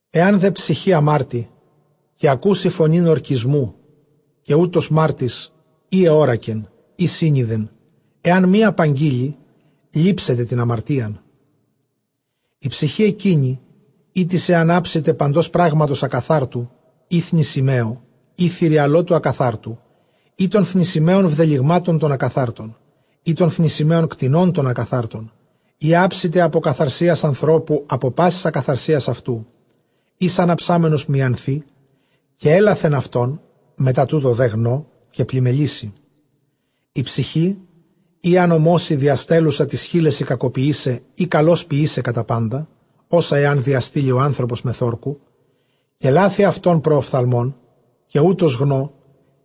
Ἐὰν δὲ ψυχὴ ἁμάρτῃ, καὶ ἀκούσῃ φωνὴν ὁρκισμοῦ, καὶ οὗτος μάρτυς ἢ ἑώρακεν ἢ σύνοιδεν, ἐὰν μὴ ἀπαγγείλῃ, λήψεται τὴν ἁμαρτίαν. Ἡ ψυχὴ ἐκείνη ἥτις ἐὰν ἅψηται παντὸς πράγματος ἀκαθάρτου, ἢ θνησιμαίου, ἢ θηριαλώτου ἀκαθάρτου, ἢ τῶν θνησιμαίων βδελυγμάτων τῶν ἀκαθάρτων, ἢ τῶν θνησιμαίων κτηνῶν τῶν ἀκαθάρτων, ἢ ἅψηται ἀπὸ ἀκαθαρσίας ἀνθρώπου, ἀπὸ πάσης ἀκαθαρσίας αὐτοῦ, ἧς ἂν ἁψάμενος μιανθῇ καὶ ἔλαθεν αὐτόν, μετὰ τοῦτο δὲ γνῷ, καὶ πλημμελήσῃ. Ἡ ψυχὴ ἡ ἄνομος, ἡ διαστέλλουσα τοῖς χείλεσι κακοποιῆσαι ἢ καλῶς ποιῆσαι κατὰ πάντα ὅσα ἐὰν διαστείλῃ ὁ ἄνθρωπος μεθʼ ὅρκου, καὶ λάθῃ αὐτὸν πρὸ ὀφθαλμῶν, καὶ οὗτος γνῷ,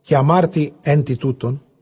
καὶ ἁμάρτῃ ἕν τι τούτων.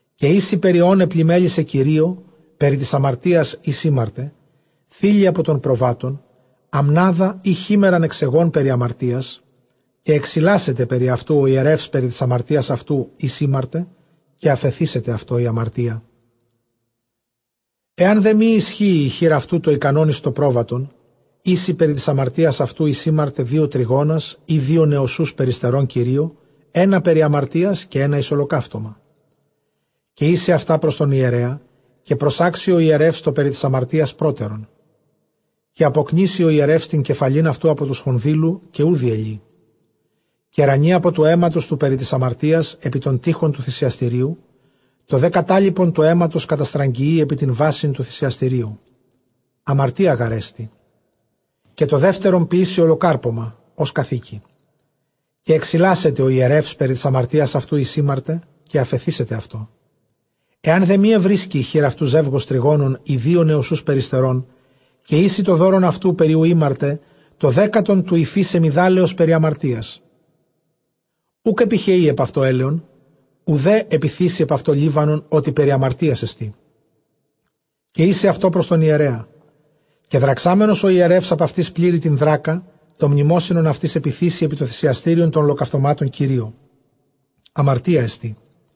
Καὶ οἴσει περὶ ὧν ἐπλημμέλησε Κυρίῳ, περὶ τῆς ἁμαρτίας ἧς ἥμαρτε, θῆλυ ἀπὸ τῶν προβάτων ἀμνάδα, ἢ χίμαιραν ἐξ αἰγῶν, περὶ ἁμαρτίας· καὶ ἐξιλάσεται περὶ αὐτοῦ ὁ ἱερεὺς περὶ τῆς ἁμαρτίας αὐτοῦ, ἧς ἥμαρτε, καὶ ἀφεθήσεται αὐτῷ ἡ ἁμαρτία. Ἐὰν δὲ μὴ ἰσχύῃ ἡ χεὶρ αὐτοῦ τὸ ἱκανὸν εἰς τὸ πρόβατον, οἴσει περὶ τῆς ἁμαρτίας αὐτοῦ, ἧς ἥμαρτε, δύο τρυγόνας, ἢ δύο νοσσοὺς περιστερῶν Κυρίῳ, ἕνα περὶ ἁμαρτίας, καὶ ἕνα εἰς ὁλοκαύτωμα. Καὶ οἴσει αὐτὰ πρὸς τὸν ἱερέα· καὶ προσάξει ὁ ἱερεὺς τὸ περὶ τῆς ἁμαρτίας πρότερον· καὶ ἀποκνίσει ὁ ἱερεὺς τὴν κεφαλὴν αὐτοῦ ἀπὸ τοῦ σφονδύλου, καὶ οὐ διελεῖ. Καὶ ῥανεῖ ἀπὸ τοῦ αἵματος τοῦ περὶ τῆς ἁμαρτίας ἐπὶ τὸν τοῖχον τοῦ θυσιαστηρίου· τὸ δὲ κατάλοιπον τοῦ αἵματος καταστραγγιεῖ ἐπὶ τὴν βάσιν τοῦ θυσιαστηρίου· ἁμαρτία γάρ ἐστι· Καὶ τὸ δεύτερον ποιήσει ὁλοκάρπωμα, ὡς καθήκει· καὶ ἐξιλάσεται ὁ ἱερεὺς περὶ τῆς ἁμαρτίας αὐτοῦ, ἧς ἥμαρτε, καὶ ἀφεθήσεται αὐτῷ. Ἐὰν δὲ μὴ εὑρίσκῃ ἡ χεὶρ αὐτοῦ ζεῦγος τρυγόνων, ἢ δύο νοσσούς περιστερῶν, καὶ οἴσει τὸ δῶρον αὐτοῦ, περὶ οὗ ἥμαρτε, τὸ δέκατον τοῦ οἰφὶ σεμιδάλεως περὶ ἁμαρτίας· οὐκ ἐπιχεεῖ ἐπʼ αὐτὸ ἔλαιον, οὐδὲ ἐπιθήσει ἐπʼ αὐτῷ λίβανον, ὅτι περὶ ἁμαρτίας ἐστί. Καὶ οἴσει αὐτὸ πρὸς τὸν ἱερέα· καὶ δραξάμενος ὁ ἱερεὺς ἀπʼ αὐτῆς πλήρη τὴν δράκα, τὸ μνημόσυνον αὐτῆς ἐπιθήσει ἐπὶ τὸ θυσιαστήριον τῶν ὁλοκαυτωμάτων Κυρίῳ· ἁμαρτία ἐστί.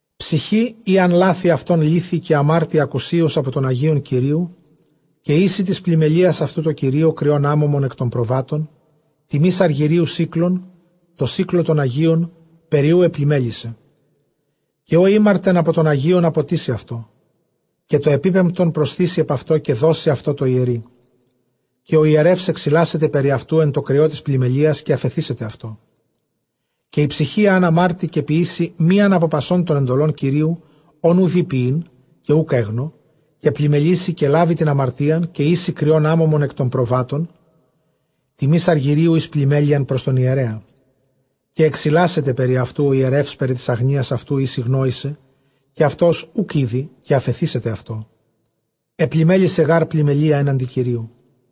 ψυχὴ ἣ ἂν λάθῃ αὐτὸν λήθῃ, καὶ ἁμάρτῃ ἀκουσίως ἀπὸ τῶν ἁγίων Κυρίου, καὶ οἴσει τῆς πλημμελείας αὐτοῦ τῷ Κυρίῳ κριὸν ἄμωμον ἐκ τῶν προβάτων, τιμῆς ἀργυρίου σίκλων, τῷ σίκλῳ τῶν ἁγίων, περὶ οὗ ἐπλημμέλησε. Καὶ ὃ ἥμαρτεν ἀπὸ τῶν ἁγίων ἀποτίσει αὐτὸ, καὶ τὸ ἐπίπεμπτον προσθήσει ἐπʼ αὐτὸ, καὶ δώσει αὐτὸ τῷ ἱερεῖ· καὶ ὁ ἱερεὺς ἐξιλάσεται περὶ αὐτοῦ ἐν τῷ κριῷ τῆς πλημμελείας, καὶ ἀφεθήσεται αὐτῷ. Καὶ ἡ ψυχὴ ἣ ἂν ἁμάρτῃ, καὶ ποιήσει μίαν ἀπὸ πασῶν τῶν ἐντολῶν Κυρίου, ὧν οὐ δεῖ ποιεῖν, καὶ οὐκ ἔγνω, καὶ πλημμελήσῃ, καὶ λάβῃ τὴν ἁμαρτίαν, καὶ οἴσει κριὸν ἄμωμον ἐκ τῶν προβάτων, τιμῆς ἀργυρίου εἰς πλημμέλειαν πρὸς τὸν ἱερέα· καὶ ἐξιλάσεται περὶ αὐτοῦ ὁ ἱερεὺς περὶ τῆς ἀγνοίας αὐτοῦ, ἧς ἠγνόησε, καὶ αὐτὸς οὐκ ᾔδει, καὶ ἀφεθήσεται αὐτῷ. Ἐπλημμέλησε γὰρ πλημμελείᾳ ἔναντι Κυρίου.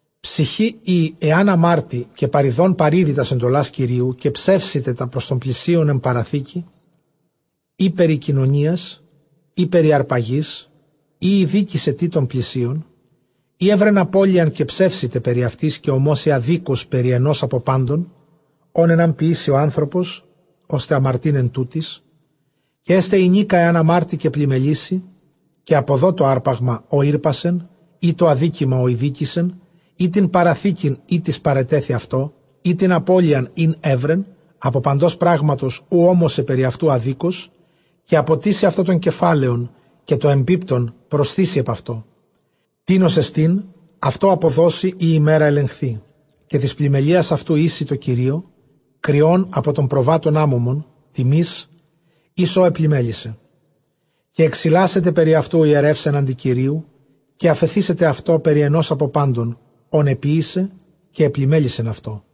ψυχὴ ἣ ἂν ἁμάρτῃ, καὶ παριδὼν παρίδῃ τὰς ἐντολὰς Κυρίου, καὶ ψεύσηται τὰ πρὸς τὸν πλησίον ἐν παραθήκῃ, ἢ περὶ κοινωνίας, ἢ περὶ ἁρπαγῆς, ἢ ἠδίκησέ τι τὸν πλησίον, ἢ εὗρεν ἀπωλίαν, καὶ ψεύσηται περὶ αὐτῆς, καὶ ὀμόσῃ ἀδίκως περὶ ἑνὸς ἀπὸ πάντων, ὧν ἐὰν ποιήσῃ ὁ ἄνθρωπος, ὥστε ἁμαρτεῖν ἐν τούτοις· Καὶ ἔσται ἡνίκα ἐὰν ἁμάρτῃ, καὶ πλημμελήσῃ, καὶ ἀποδῷ τὸ ἅρπαγμα, ὃ ἥρπασεν, ἢ τὸ ἀδίκημα, ὃ ἠδίκησεν, ἢ τὴν παραθήκην, ἥτις παρετέθη αὐτῷ, ἢ τὴν ἀπώλειαν, ἣν εὗρεν ἀπὸ παντὸς πράγματος, οὗ ὤμοσε περὶ αὐτοῦ ἀδίκως, καὶ ἀποτίσει αὐτὸ τὸ κεφάλαιον, καὶ τὸ ἐπίπεμπτον προσθήσει ἐπʼ αὐτὸ, τίνος ἐστίν, αὐτῷ ἀποδώσει ᾗ ἡμέρᾳ ἐλεγχθῇ. Καὶ τῆς πλημμελείας αὐτου οἴσει τῷ Κυρίῳ κριὸν ἀπὸ τῶν προβάτων ἄμωμον, τιμῆς, εἰς ὃ ἐπλημμέλησε. Καὶ ἐξιλάσεται περὶ αὐτοῦ ὁ ἱερεὺς ἔναντι Κυρίου, καὶ ἀφεθήσεται αὐτῷ περὶ ἑνὸς ἀπὸ πάντων ὧν ἐποίησε καὶ ἐπλημμέλησεν αὐτῷ.